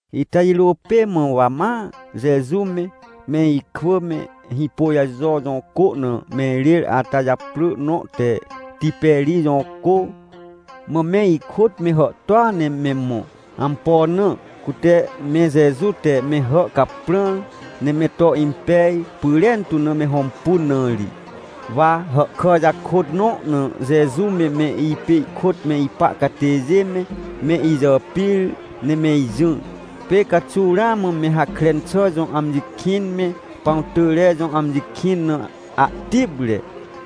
Ita jirô pê mã, wa ma Jeju me, me ikwỳ me, Hĩpôjajo jõ cô na me irêr, ata japrỳ nõ te Tiperij jõ cô. Mã me ikôt me hàhtôa ne me mõ. Ampo na? Cute me Jeju te me hà caprãr, ne me to impej pyrentu na me hõmpun na ri. Wa hàhkà jakôt nõ na Jeju me, me ipê ihkôt me ipa catêjê me, me ijàpir ne me ijỹr. Pê caxuw ramã me Hakren xà jõ amji kĩn me Pãwtỳjre jõ amji kĩn na ahtipre.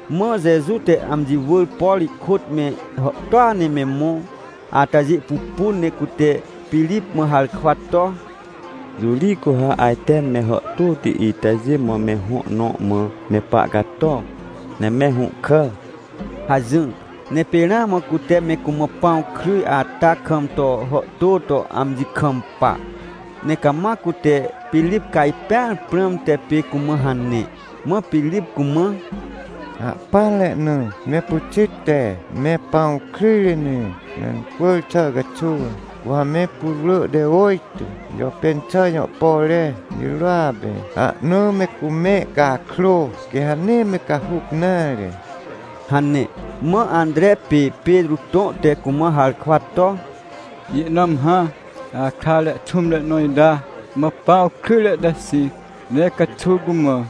Mã Jeju te amji wỳr, por ihkôt me hàhtôa ne me mõ atajê pupun, ne cute Pirip mã harkwa to: — Jõ ri cu ha ajte me hàhtôti itajê mã me hõ nõ mã me pahcato, ne me hũhkà? — hajỹr. Ne pê ramã cute me cumã pãw kryj ata kam to hàhtô to amji kampa, ne cama cute Pirip cajpẽar prãmte pê cumã hane. Mã Pirip cumã: — Ahpỹanre na me pyxit te me pãw kryjre ne mencwỳr xà caxuw, cu ha me putwrỳ te ôjtô jàpên xà jõ pore jirôa pê ahna me cumẽ cakrô, quê ha nee me cahuc nare — hane. Mã Antre pê Petrô tõ te cumã harkwa to: — Ihnãm hã ahkrare xũmre nõ ita mã pãw kryjre te xĩc, ne caxuw cumã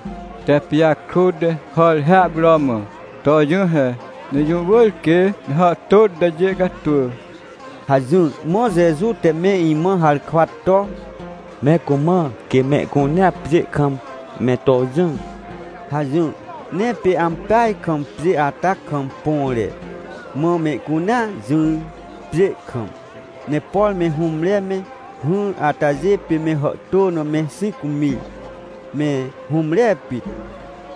tep pijakrut ne hàr hiahpuro mã to jỹ he, ne jũ wỳr quê me hàhtôti itajê catwỳ! — hajỹr. Mã Jeju te me imã harkwa to: — Me cumã, quê mehcunea pjê kam me to jỹ — hajỹr. Ne pê ampeaj kam pjê ata kam põre. Mã mehcunea jỹr, pjê kam, ne por me hũmre me hỹr atajê pê me hàhtô na me xĩc mir, me hũmre pit.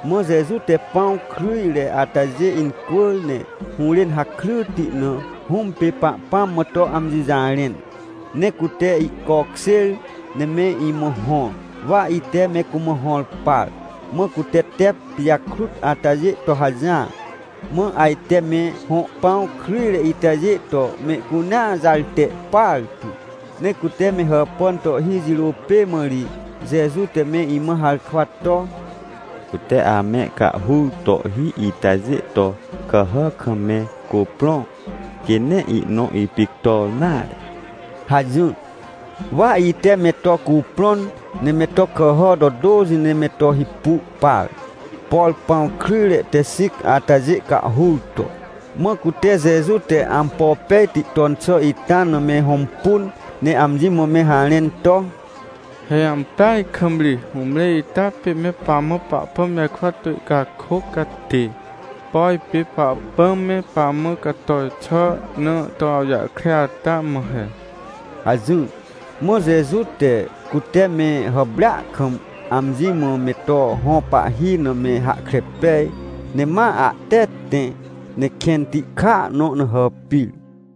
Mã Jeju te pãw kryjre atajê incwỳr ne hũrên hakryti na Hũm pê Pahpãm mã to amji jarẽn. Ne cute ihcokjêr ne me imã hõr, wa ite me cumã hõr par, mã cute tep pijakrut atajê to hajỹar. Mã ajte me hõ pãw kryjre itajê to mehcunea jarte partu. Ne cute me hàpàn tohhi jirô pê mã ri, Jeju te me imã harkwa to: — Cute ame cahhur tohhi itajê to kàhà kam me cuprõ, quê nee ihnõ ipictor nare — hajỹr. Wa ite me to cuprõn, ne me to kàhà to tôxi ne me to hipu par, por pãw kryjre te xĩc atajê cahhur to. Mã cute Jeju te ampo pejti ton xà ita na me hõmpun, ne amji mã me harẽn to: — He ampeaj kam ri hũmre ita pê me pamã Pahpãm jarkwa to ihcakôc catê, por pê Pahpãm me pamã cator xà na to awjahkre ata mã he — hajỹr. Mã Jeju te, cute me hàprêa kam amji mã me to hõ pahhi na me hahkre pej, ne ma ahte tẽ, ne kẽnti kàa nõ na hàpir.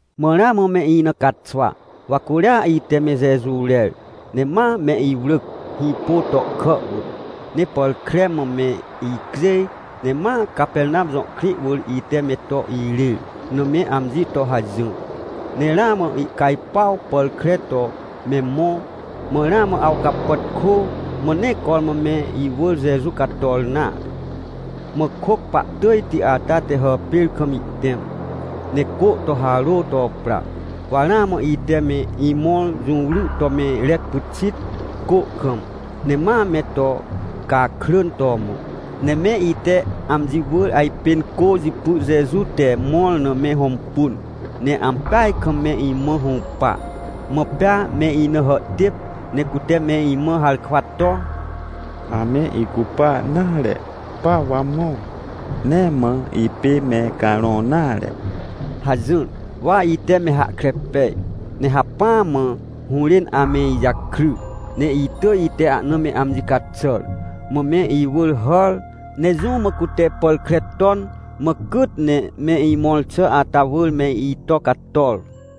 Mã ramã me ina caxwa, wa curia ite me Jeju rer, ne ma me iwrỳc, hĩpô tohkà wỳr. Ne pàr kre mã me icjêj, ne ma Capernam jõ krĩ wỳr ite me to irêr na me amji to hajỹr. Ne ramã ihcajpuaw pàr kre to me mõ, mã ramã awcapàtkô, mã nee cormã me iwỳr Jeju cator nare. Mã kôc pahtỳjti ata te hàpêr kam ihtẽm, ne cô to harô to pra. Wa ramã ite me imõr jũwry to me rec pyxit, cô kam, ne ma me to cakrỳn to mõ. Ne me ite amji wỳr ajpên cô jipy Jeju te mõr na me hõmpun, ne ampeaj kam me imã hũpa. Mã pea me ina hàhtêp, ne cute me imã harkwa to: — Ame icupa nare, pa wa mõ, nee mã ipê me carõ nare — hajỹr. Wa ite me hahkre pej, ne hacpỹa mã hũrên ame ijakry, ne itỳj ite ahna me amji caxàr. Mã me iwỳr hàr, ne jũ mã cute pàr kre ton, mã cyt ne me imõr xà ata wỳr me ito icator.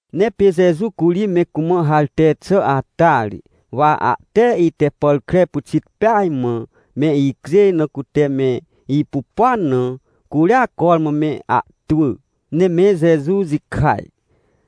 Ne pê Jeju curi me cumã harte xà ata ri, wa ahte ite pàr kre pyxit peaj mã me icjêj na cute me ipupuan na, curia cormã me ahtwỳ, ne me Jeju jikaj.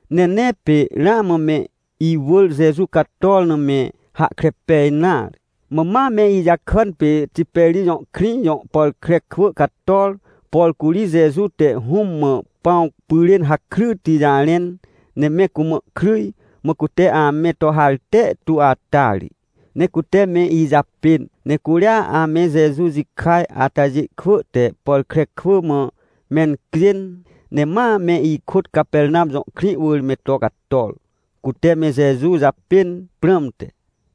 Ne nee pê ramã me iwỳr Jeju cator na me hahkre pej nare. Mã ma me ijakàn pê Tiperij jõ krĩ jõ pàr kre kwỳ cator, por curi Jeju te Hũm mã pãw pyrên hakryti jarẽn, ne me cumã kryj, mã cute ame to harte tu ata ri. Ne cute me ijapên, ne curia ame Jeju jikaj atajê kwỳ te pàr kre kwỳ mã mencjên, ne ma me ikôt Capernam jõ krĩ wỳr me to cator, cute me Jeju japên prãmte.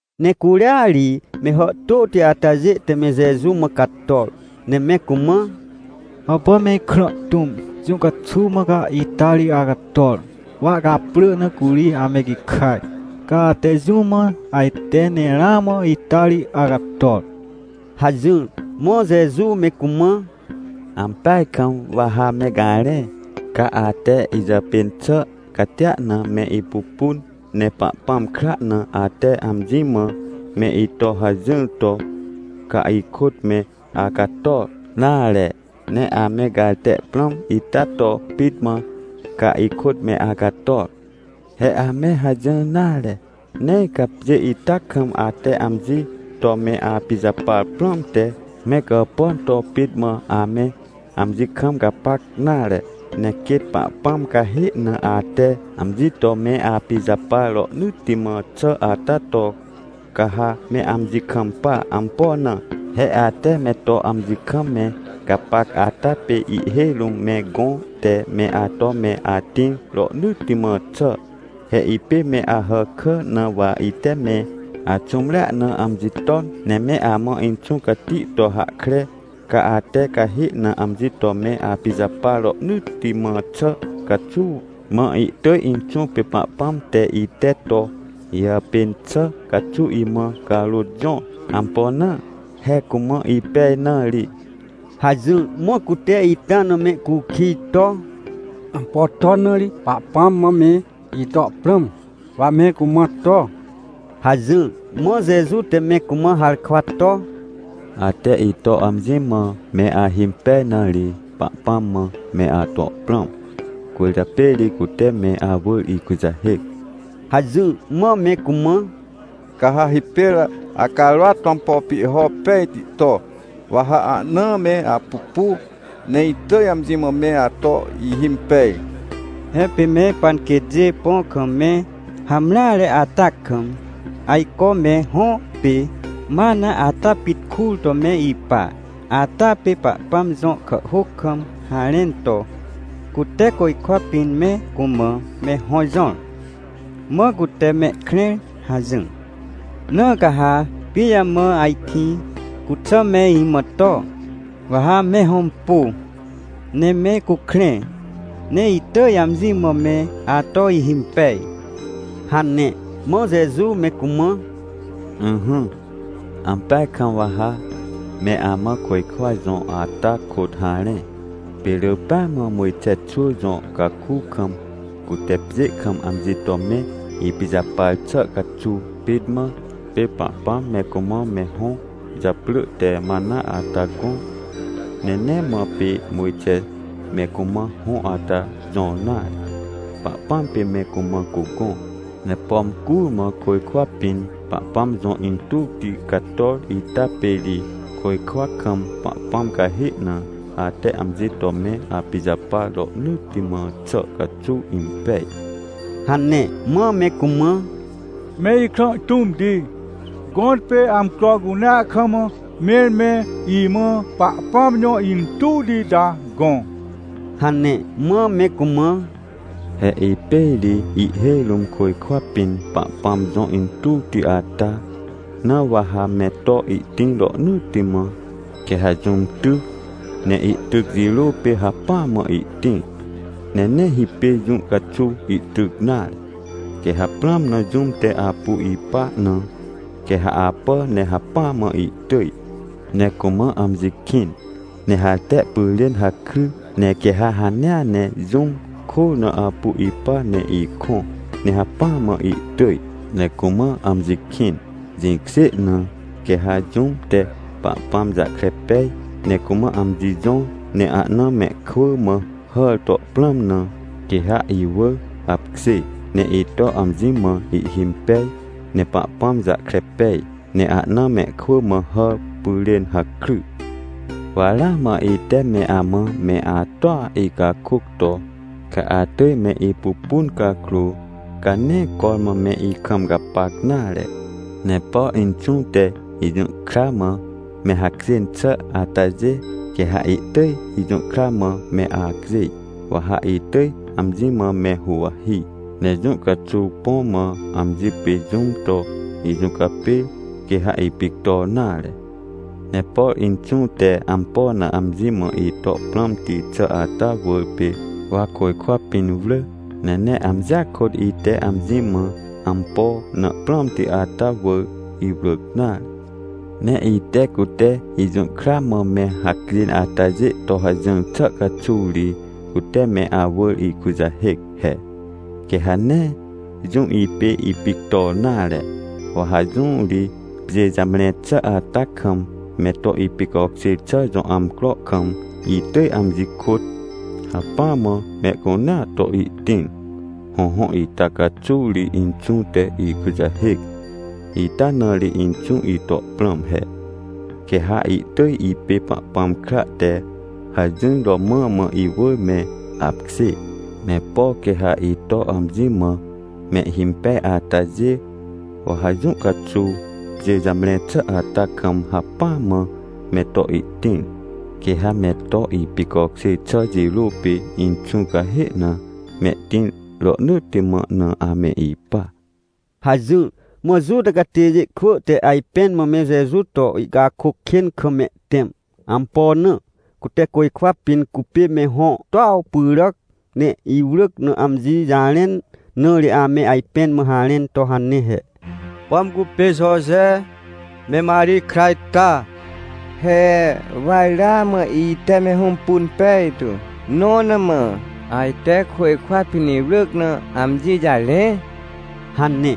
Ne curia ri me hàhtôti atajê te me Jeju mã cator ne me cumã: — Hàpà me Ikrã tũm! Jũ caxuw mã ca ita ri acator? Wa ihcaprỳ na curi ame gikaj, ca ate jũ mã ajte ne ramã ita ri acator? — hajỹr. Mã Jeju me cumã: — Ampeaj kam wa ha me garẽ! Ca ate ijàpên xà catia na me ipupun, ne Pahpãm kra na ate amji mã me ito hajỹr to, ca ikôt me acator nare. Ne ame garte prãm ita to pit mã, ca ikôt me acator. He ame hajỹr nare! Nee ca pjê ita kam, ate amji to me apijapar prãmte, me gàpàn to pit mã ame amji kam gapac nare. Ne quêt Pahpãm cahê na ate amji to me apijapar rohnỳtti mã xà ata to, ca ha me amji kampa. Ampo na? He ate me to amji kam me gapac ata pê ihhêj rũm me gõ te me ato me atĩr rohnỳtti mã xà. He ipê me Ahàkà, na wa ite me axũmrea na amji ton, ne me amã Inxũ Cati to hahkre, ca ate cahê na amji to me apijapar rohnỳtti mã xà caxuw. Mã ihtỳj Inxũ pê Pahpãm te, ite to ijàpên xà caxuw imã carôt jõr. Ampo na? He cumã ipej na ri — hajỹr. Mã cute ita na mehcukij to: — Ampo ton na ri Pahpãm mã me ito prãm, wa me cumã to? — hajỹr. Mã Jeju te me cumã harkwa to: — Ate ito amji mã me ahimpej na ri, Pahpãm mã me ato prãm, cwỳrjapê ri cute me awỳr ikujahêc — hajỹr. Mã me cumã: — Ca ha hipêr acarôat to ampo pihho pejti to! Wa ha ahna me apupu, ne itỳj amji mã me ato ihimpej! He pê me panquêtjê põ kam me hamreare ata kam ajco me hõ pê mana ata pit kur to me ipa, ata pê Pahpãm jõ kàhhôc kam harẽn to: “Cute côjkwa pĩn me cumã me hõ jõr, mã cute mehkrẽr” hajỹr. Na ca ha pijamã ajkĩ cuxà me imã to? Wa ha me hõmpu, ne me cukrẽ, ne itỳj amji mã me ato ihimpej — hane. Mã Jeju me cumã: — Ỹhỹ, ampeaj kam wa ha me amã côjkwa jõ ata kôt harẽ. Pê rỳ pêa mã Mojxe xwỳ jõ caku kam, cute pjê kam amji to me ipijapar xà caxuw pit mã, pê Pahpãm me cumã me hõ japrỳ te mana ata gõ. Ne nee mã pê Mojxe me cumã hõ ata jõr nare, Pahpãm pê me cumã cugõ. Ne pom curmã côjkwa pĩn Pahpãm jõ intuwti cator ita pê ri côjkwa kam Pahpãm cahê na ate amji to me apijapar rohnỳtti mã xà caxuw impej — hane. Mã me cumã: — Me Ikrã tũmti, gõtpê amcro cunea kam, mẽr me imã Pahpãm jõ intuwti ita gõ! — hane. Mã me cumã: — He ipê ri ihhêj rũm côjkwa pĩn Pahpãm jõ intuwti ata, na wa ha me to ihtĩr rohnỳtti mã. Quê ha jũm ty, ne ihtyc jirô pê hacpỹa mã ihtĩr, ne nee hipêr jũ caxuw ihtyc nare. Quê ha prãm na jũm te apu ipa na, quê ha apà ne hacpỹa mã ihtỳj, ne cumã amji kĩn, ne harte pyrên hakry. Ne quê ha hanea ne jũm kôr na apu ipa ne ikõ, ne hacpỹa mã ihtỳj ne cumã amji kĩn. Jĩkjê na, quê ha jũm te Pahpãm jahkre pej ne cumã amji jõr, ne ahna mehkwỳ mã hàr to prãm na, quê ha iwỳr apkjê ne ito amji mã ihhimpej, ne Pahpãm jahkre pej, ne ahna mehkwỳ mã hàr pyrên hakry. — Wa ramã ite me amã me atoa icakôc to, ca atỳj me ipupun cakrô, ca nee cormã me ikam gapac nare. Ne por Inxũ te ijũhkra mã me hacjên xà atajê, quê ha ihtỳj ijũhkra mã me acjêj, wa ha itỳj amji mã me huwahi, ne jũ caxuw põ mã, amji pê, jũm to ijũcapêr, quê ha ipictor nare. Ne por Inxũ te ampo na amji mã ito prãmti xà ata wỳr pê wa côjkwa pĩn wrỳ. Ne nee amjia kôt ite amji mã ampo na prãmti ata wỳr, iwrỳc nare. Ne ite, cute ijũhkra mã me hacjên atajê to hajỹr xà caxuw ri, cute me awỳr ikujahêc he. Quê ha nee jũm ipê ipictor nare. Wa ha jõ ri pjê jamre xà ata kam, me to ipicokjêr xà jõ amcro kam, itỳj amji kôt hacpỹa mã mehcunea to ihtĩr. Hõhõ, ita caxuw ri Inxũ te ikujahêc. Ita na ri Inxũ ito prãm he. Quê ha ihtỳj ipê Pahpãm kra te hajỹr romã mã iwỳr me apkjê. Ne por quê ha ito amji mã mehhimpej atajê, wa ha jũ caxuw, pjê jamre xà ata kam, hacpỹa mã me to ihtĩr. Quê ha me to ipicokjêr xà jirô pê Inxũ cahê na mehtĩr rohnỳtti mã na ame ipa — hajỹr. Mã Juta catêjê kwỳ te ajpẽn mã me Jeju to ihcakôc kên kam mehtẽm. Ampo na? Cute côjkwa pĩn cupê me hõ tuaw pyràc ne iwrỳc na amji jarẽn, na ri ame ajpẽn mã harẽn to hane he: — Pom cupê Joje me Marij kra ita? He wa ramã ite me hõmpun pejtu, nõ na mã ajte côjkwa pĩn iwrỳc na amji jarẽ? — hane.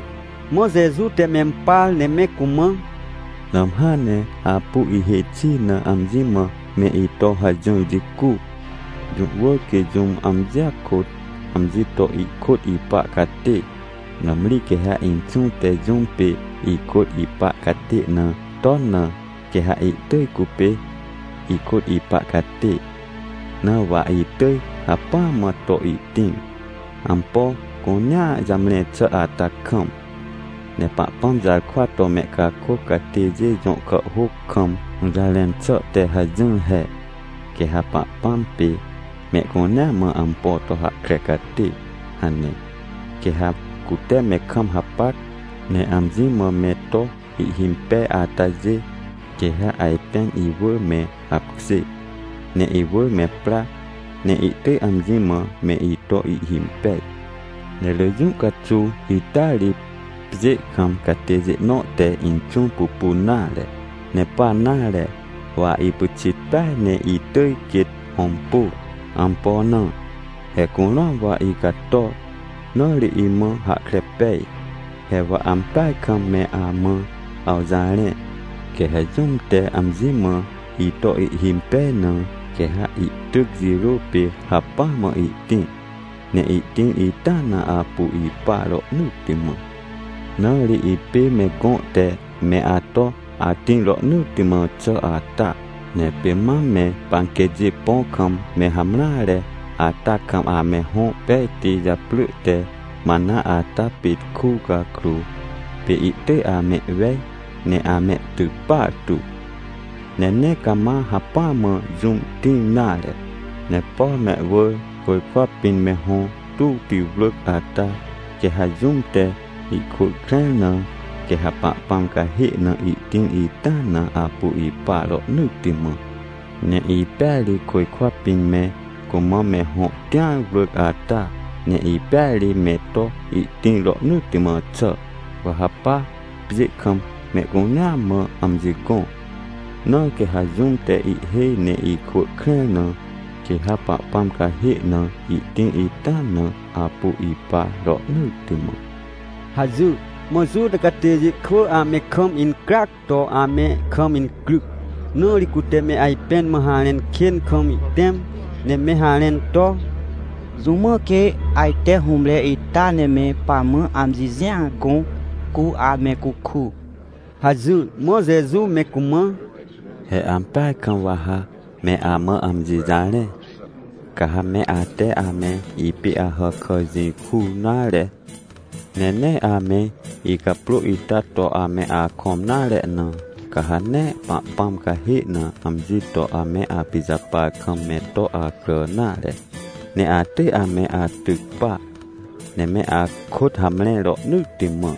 Mã Jeju te mempar ne me cumã: — Nãmhã ne apu ihêj xi na amji mã me ito hajỹr jicu. Jũ wỳr quê jũm amjia kôt amji to ikôt ipa catê. Nãmri quê ha Inxũ te jũm pê ikôt ipa catê na ton na, quê ha ihtỳj cupê ikôt ipa catê. Na wa ha itỳj hacpỹa mã to ihtĩr, ampo cunea jamre xà ata kam. Ne Pahpãm jarkwa to mehcakôc catêjê jõ kàhhôc kam hũjarẽn xà te hajỹr he: “Quê ha Pahpãm pê mehcunea mã ampo to hahkre catê” hane. Quê ha cute me kam hapac, ne amji mã me to ihhimpej atajê, quê ha ajpên iwỳr me apkjê, ne iwỳr me pra, ne ihtỳj amji mã me ito ihhimpej. Ne rỳ jũ caxuw ita ri, pjê kam catêjê nõ te Inxũ pupun nare, ne pa nare. Wa ipyxit peaj ne itỳj quêt hõmpu. Ampo na? He curũam wa icator, na ri imã hahkre pej. — He wa ampeaj kam me amã awjarẽ, quê ha jũm te amji mã ito ihhimpej na, quê ha ihtyc jirô pê hacpỹa mã ihtĩr, ne ihtĩr ita na apu ipa rohnỳtti mã. Na ri ipê me gõ te me ato atĩr rohnỳtti mã xà ata. Ne pê mam me panquêtjê põ kam me hamreare ata kam ame hõ pejti japrỳ te mana ata pit ku cakrô, pê ihtỳj amehwej ne amehtyc partu, ne nee cama hacpỹa mã jũm tĩr nare. Ne por mehwỳr côjkwa pĩn me hõ tuwti wrỳc ata, quê ha jũm te ihkwỳ krẽr na, quê ha Pahpãm cahê na ihtĩr ita na apu ipa rohnỳtti mã. Ne ipêa ri côjkwa pĩn me cumã me hõ tĩar wrỳc ata. Ne ipêa ri me to ihtĩr rohnỳtti mã xà. Wa ha pa, pjê kam mehcunea mã amji gõ. Na quê ha jũm te ihhêj ne ikwỳ krẽr na, quê ha Pahpãm cahê na ihtĩr ita na apu ipa rohnỳtti mã — hajỹr. Mã Juta catêjê kwỳ ame kam incryac to ame kam incryc, na ri cute me ajpẽn mã harẽn kên kam ihtẽm, ne me harẽn to: — Jũ mã quê ajte hũmre ita ne me pamã amji jĩa gõ, cu ame cuku? — hajỹr. Mã Jeju me cumã: — He ampeaj kam wa ha me amã amji jarẽ, ca ha me ate ame ipê Ahàkà jĩ kur nare, ne nee ame icaprô ita to ame akõm nare na, ca ha nee Pahpãm cahê na amji to ame apijapar kam me to acrà nare, ne atỳj ame atyc pa, ne me akôt hamre rohnỳtti mã.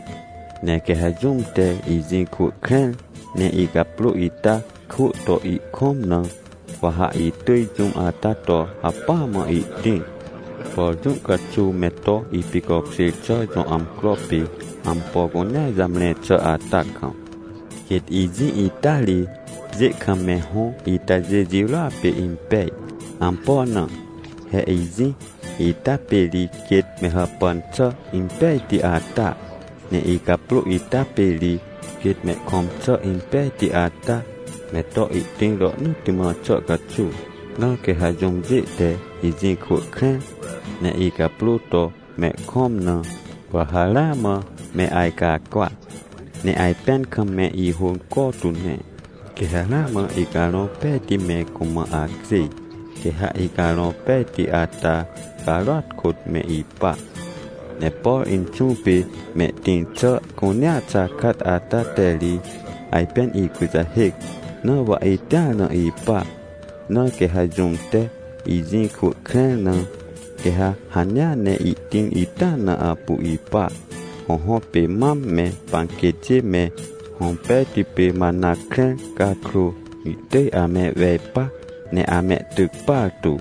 Ne quê ha jũm te ijĩ kwỳ krẽr, ne icaprô ita kwỳ to ihkõm na, wa ha itỳj jũm ata to hacpỹa mã ihtĩr, por jũ caxuw me to ipicokjêr xà jõ amcro pê ampo cunea jamre xà ata kam. Quêt ijĩ ita ri pjê kam me hõ itajê jirôa pê impej. Ampo na? He ijĩ ita pê ri quêt me hàpàn xà impejti ata, ne icaprô ita pê ri quêt mehkõm xà impejti ata, me to ihtĩr rohnỳtti mã xà caxuw. Na quê ha jũmjê te ijĩ kwỳ krẽr, ne icaprô to mehkõm na, wa ha ramã me ajcacwa, ne ajpẽn kam me ihônco tu ne. Quê ha ramã Icarõ Pejti me cumã acjêj, quê ha Icarõ Pejti ata carôat kôt me ipa. Ne por Inxũ pê mehtĩr xà cunea xakat ata te ri ajpên ikujahêc, na wa itĩar na ipa. Na quê ha jũm te ijĩ kwỳ krẽr na, quê ha hanea ne ihtĩr ita na apu ipa. Hõhõ, pê mam me panquêtjê me hõ pejti pê mana krẽr cakrô, ihtỳj amehwej pa, ne amehtyc partu.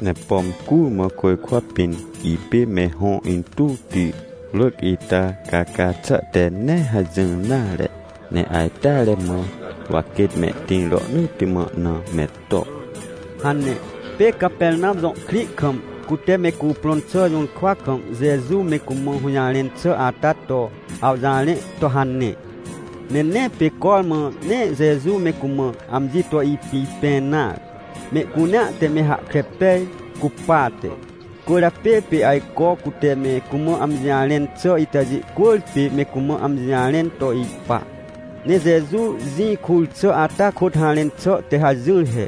Ne pom curmã côjkwa pĩn ipê me hõ intuwti wrỳc ita caca xà te nee hajỹr nare, ne ajteare mã, wa quêt mehtĩr rohnỳtti mã na me to — hane. Pê Capernam jõ krĩ kam, cute me cuprõn xà jũrkwa kam Jeju me cumã hũjarẽn xà ata to awjarẽ to hane. Ne nee pê cormã ne Jeju me cumã amji to ipipẽ nare, mehcunea te me hahkre pej cupate. Cwỳrjapê pê ajco cute me cumã amji jarẽn xà itajê cwỳrpê me cumã amji jarẽn to ipa. Ne Jeju jĩ kur xà ata kôt harẽn xà te hajỹr he.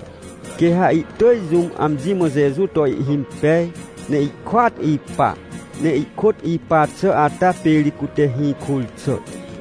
Quê ha ihtỳj jũm amji mã Jeju to ihhimpej, ne ihkôat ipa, ne ihkôt ipa xà ata pê ri cute hĩ kur xà.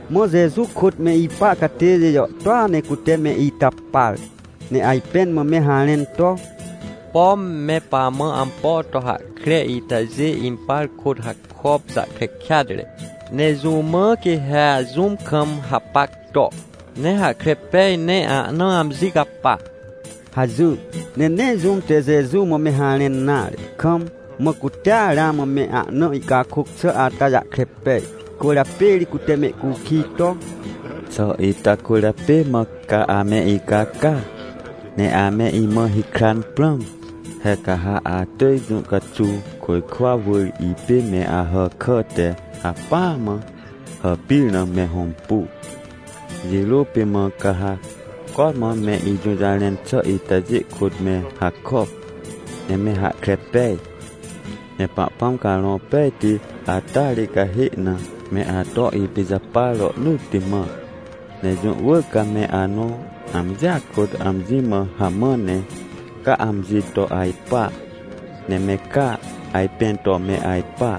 Mã Jeju kôt me ipa catêjê jàhtôa ne cute me ita par, ne ajpẽn mã me harẽn to: — Pom me pamã ampo to hahkre itajê impar kôt hakop jahkre kêatre! Ne jũ mã quê ha jũm kam hapac to, ne hahkre pej ne ahna amji capa? — hajỹr. Ne nee jũm te Jeju mã me harẽn nare kam, mã cutea ramã me ahna ihcakôc xà ata jahkre pej, cwỳrjapê ri cute mehcukij to: — Xà ita cwỳrjapê mã ca ame icaca, ne ame imã hikran prãm? He ca ha atỳj jũ caxuw côjkwa wỳr ipê me Ahàkà te hacpỹa mã hàpir na me hõmpu. Jirô pê mã ca ha cormã me ijũjarẽn xà itajê kôt me hakop, ne me hahkre pej. Ne Pahpãm Carõ Pejti ata ri cahê na me ato ipijapar rohnỳtti mã. Ne jũ wỳr ca me anõ amjia kôt amji mã hamã ne ca amji to ajpa, ne me ca ajpẽn to me ajpa.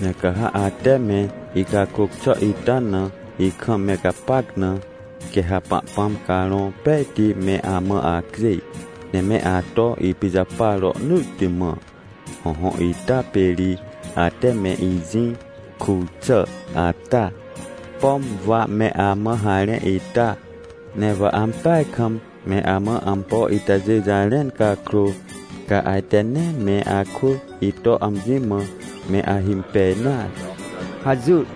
Ne ca ha ate me icakôc xà ita na ikam me gapac na, quê ha Pahpãm Carõ Pejti me amã acjêj, ne me ato ipijapar rohnỳtti mã. Hõhõ, ita pê ri ate me ijĩ kur xà ata, pom wa me amã harẽ ita. Ne wa ampeaj kam me amã ampo itajê jarẽn cakrô, ca ajte nee me akwỳ ito amji mã me ahimpej nare — hajỹr.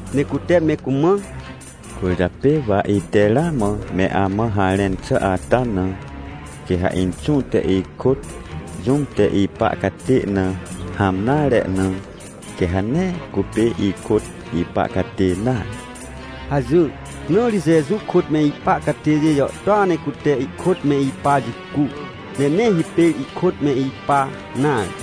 Ne cute me cumã: — Cwỳrjapê wa ite ramã me amã harẽn xà ata na, quê ha Inxũ te ikôt jũm te ipa catê na hãm nare na, quê ha nee cupê ikôt ipa catê nare — hajỹr. Na ri Jeju kôt me ipa catêjê jàhtôa ne cute ihkôt me ipa jicu, ne nee hipêr ihkôt me ipa nare.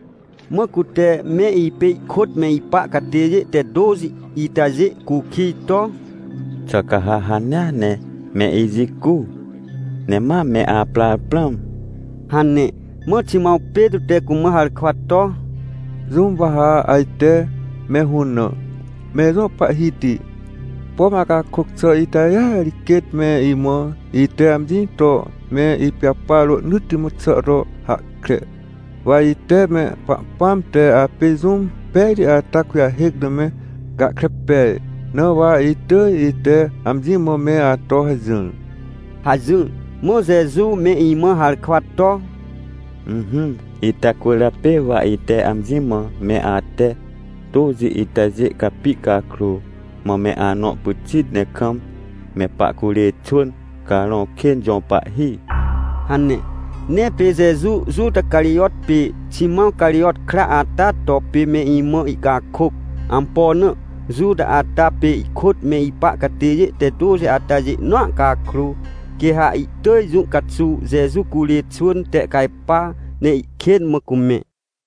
Mã cute me ipê ihkôt me ipa catêjê te tôxi itajê cukij to: — Xà ca ha hanea ne me ijicu, ne ma me aprar prãm? — hane. Mã Ximãw Petrô te cumã harkwa to: — Jũm wa ha ajte me hũnã? Me ijõ Pahhiti, pom acakôc xà itajêa ri quêt me imã ite amji to me ipijapar rohnỳtti mã xà to hahkre. Wa ite me Pahpãm te apê jũm pejti ata kujahêc na me gahkre pej, na wa itỳj ite amji mã me ato hajỹr — hajỹr. Mã Jeju me imã harkwa to: — Ỹhỹ ita cwỳrjapê wa ite amji mã me ate tôxi itajê capi cakrô, mã me anõ pyxit ne kam me pahcurê xwỳn carõ kên jõ pahhi — hane. Ne pê Jeju, Juta Carijot pê Ximãw Carijot kra ata to, pê me imã ihcakôc. Ampo na? Juta ata pê ihkôt me ipa catêjê te tôxi atajê nõa cakrô, quê ha ihtỳj jũ caxuw Jeju curê xwỳn tehcajpa, ne ihkên mã cumẽ.